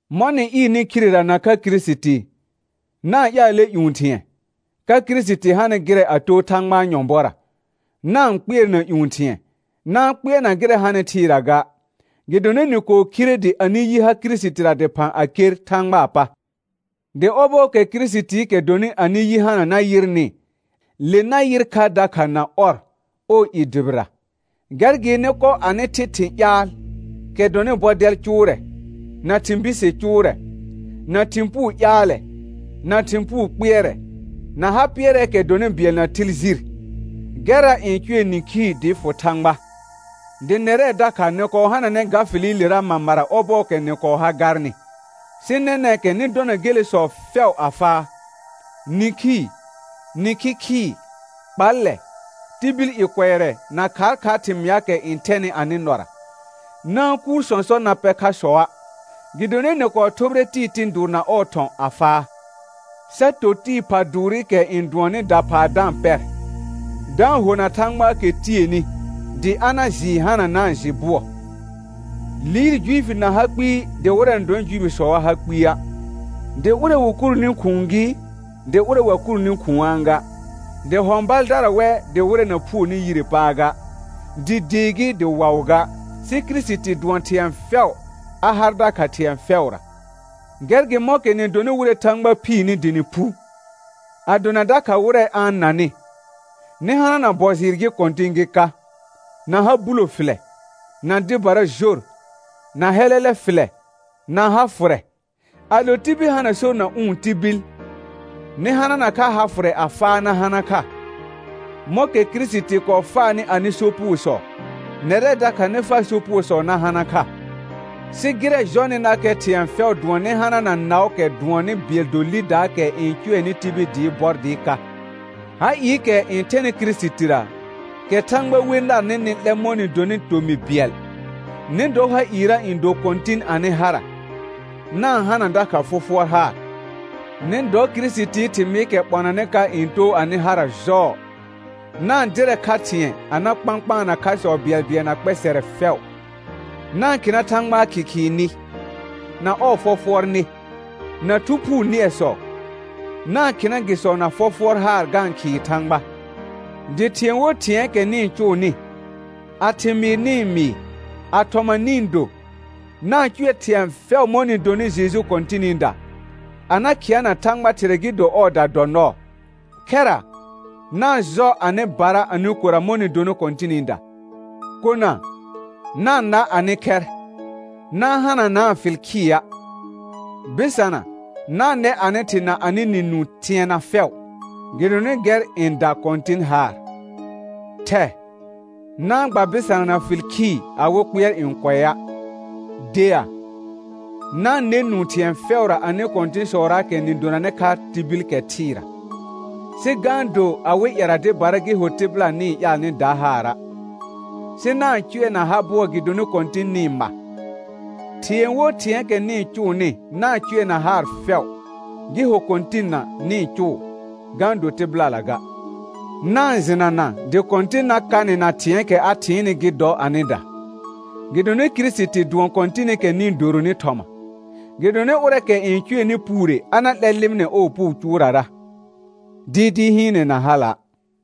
Mɔ̃ nɩ ɩɩrnɩ khirera nakha Kirisiti, na-n ƴaalɛ ƴũ thɩ̃ɛ, ka Kirisiti hanɩ gɩrɛ a too Thãgbaa nyɔ̃bɔra. Na-n kpɩɛrna ƴũ thɩ̃ɛ, na-n kpɩɛrna gɩrɛ hanɩ thɩɩra ga. Gɩdonɩ nɩ kɔɔ khire dɩ anɩ yi ha Kirisitira dɩphã a ker Thãgbaa pa. Dɩ ɔbɔɔkɛ Kirisitiikɛ dɔnɩ anɩ yi hana na yɩrnɩ, le na yɩr kha dakha na ɔr ɔɔ i dʋbɩra. Gɛr gɩ nɩ kɔ anɩ thɩ thɩ̃ ƴaal, kɛ dɔnɩ bɔdɛl cʋʋrɛ, na thɩ̃ bise cʋʋrɛ, na thɩ̃ puu ƴaalɛ, na thɩ̃ puu kpɩɛrɛ, na ha pɩɛrɛɛkɛ dɔnɩ bɩɛl na thɩl jir. Gɛrra n cʋɛ nĩkhii dɩɩ fʋ Thãgba. Dɩ nɛrɛ dakha nɩ kɔɔ hananɛ ga fɩlɩlera mamara ɔbɔɔkɛ nɩ kɔɔ ha garnɩ. Sɩ nɛnɛ̃kɛ nɩ dɔna gelesɔ fɛʋ a faa: Nĩkhii, nĩkhi khɩɩ, kpallɛ, tibil i kʋɛrɛ na khaakhaar thɩmɩaakɛ n thɛnɩ anɩ nɔra. Na-n kuur sɔ̃sɔ na pɛ khasɔa', gɩdonɩ nɩ kɔɔ thʋbɩrɛ tɩɩ tɩ̃ dʋʋr na ɔɔ thɔ̃ a faa, sa to tɩɩ pha dʋʋrɩkɛ n dʋɔnnɩ daphaa da-n pɛr, da-n hona Thãgbaakɛ tieni dɩ a na jɩɩ hananaa jɩ bʋɔ. Liir Juifi na ha kpɩɩ dɩ wɩrɛ na dɔnɩ Juifisɔa ha kpɩa', dɩ ʋrɛ wɩ kurni khʋ̃ʋ gɩ dɩ ʋrɛ wa kurni khʋ̃aa ga, dɩ hɔ̃ baldara wɛ dɩ wɩrɛ na phuoni yire paa ga, dɩ dee gɩ dɩ waʋ ga; sɩ Kirisiti dʋɔn thɩ̃ɛ fɛʋ a har dakha thɩ̃ɛ fɛʋra. Gɛr gɩ mɔ̃kɛ nɩ donɩ wɩrɛ Thãgba phiirni dɩ nɩ phu, a dona dakha wɩrɛ a-n nanɩ, nɩ hanana bɔ jɩɩr gɩ kɔ̃tɩ̃ gɩ ka, na ha bulo fɩlɛ, na dɩbara jor, na hɛlɛlɛ fɩlɛ, na ha fʋrɛ. Ado tibil hana sor na ʋ̃ tibil, nɩ hanana kha ha fʋrɛ a faa na hana kha; mɔ̃kɛ Kirisiti kɔɔ faanɩ anɩ sopugosɔ, nɛrɛ dakha nɩ faa sopugosɔ na hana kha. Sɩ gɩrɛ jɔnɩnakɛ thɩ̃ɛ fɛʋ dʋɔn nɩ hanana naʋʋkɛ dʋɔnnɩ bɩɛl do lidaakɛ n cʋɛnɩ tibil dɩ bɔr dɩ ka. Ha ɩɩkɛ n thɛnɩ Kirisitira, kɛ Thãgba we narnɩ nɩ 'lɛ mɔ̃ nɩ donɩ tomɩ bɩɛl, nɩ dɔ ha ɩɩra n do kɔ̃tɩn anɩ hara, na-n hana dakha fɔfʋɔr haar. Nɩ dɔ Kirisitii thɩmɩɩkɛ ɓɔnanɩ ka n too anɩ hara jɔɔ. Na-n dɩrɛ kha thɩ̃ɛ a na kpãkpaana khasɔ bɩɛlbɩɛl na kpɛsɛrɛ fɛʋ. Na-n khɩna Thãgbaa khɩkhɩɩ nɩ, na ɔɔ fɔfʋɔr nɩ, na Thu Phuu nɩɛsɔ; na-n khɩna gɩsɔ na fɔfʋɔr haar ga-n khɩɩ Thãgba. Dɩ thɩ̃ɛ wo thɩ̃ɛɛkɛ nɩ-n cʋʋnɩ, a thɩmɩɩr nɩ-n mɩɩ, a thɔma nɩ-n do, na-n cʋɛ thɩ̃ɛ fɛʋ mɔ̃ nɩ donɩ Jeju Kɔ̃tɩnɩda, a na khɩana Thãgba Thɩrɛ gɩ do ɔɔda dɔ nɔɔ. Khɛra, na-n jɔ anɩbara anɩ kora mɔ̃ nɩ donɩ Kɔ̃tɩnɩda. Kona, na-n na anɩ khɛr, na-n hananaa fɩl khɩa'. Bɩsana, na-n nɛ anɩ thɩ na anɩ nɩ nũu thɩɛna fɛʋ, gɩdonɩ gɛr n da Kɔ̃tɩn haar. Thɛ, na-n gba bɩsanana fɩl khɩɩ awɩ kpɩɛr n kʋɛa'. Dea, na-n nɛ nũu thɩ̃ɛ fɛʋra anɩ kɔ̃tɩ̃sɔraakɛ nɩ donanɩ kha tibil kɛ thɩɩra, sɩ ga-n do awɩ ƴɛra dɩbara gɩ ho tɩbɩla nɩ-n ƴaal nɩ da haara', sɩ na-n cʋɛ na ha bʋɔ gɩdonɩ Kɔ̃tɩn nɩ-n ma. Thɩ̃ɛ wo thɩ̃ɛɛkɛ nɩ-n cʋʋnɩ na-n cʋɛ na haar fɛʋ, gɩ ho Kɔ̃tɩnna nɩ-n cʋʋ ga-n do tɩbɩlala ga; na-n jɩnana dɩ Kɔ̃tɩn na ka nɩ na thɩ̃ɛɛkɛ a thɩɩnnɩ gɩ dɔ anɩda. Gɩdonɩ Kirisiti dʋɔn Kɔ̃tɩnɩkɛ nɩ-n doronɩ thɔma. Gɩdonɩ ʋrɛɛkɛ n cʋɛnɩ puure a na 'lɛr lɩmɩnɛ ɔɔ puu cʋʋrara, dɩɩdɩɩ hɩɩnɛ na hala'.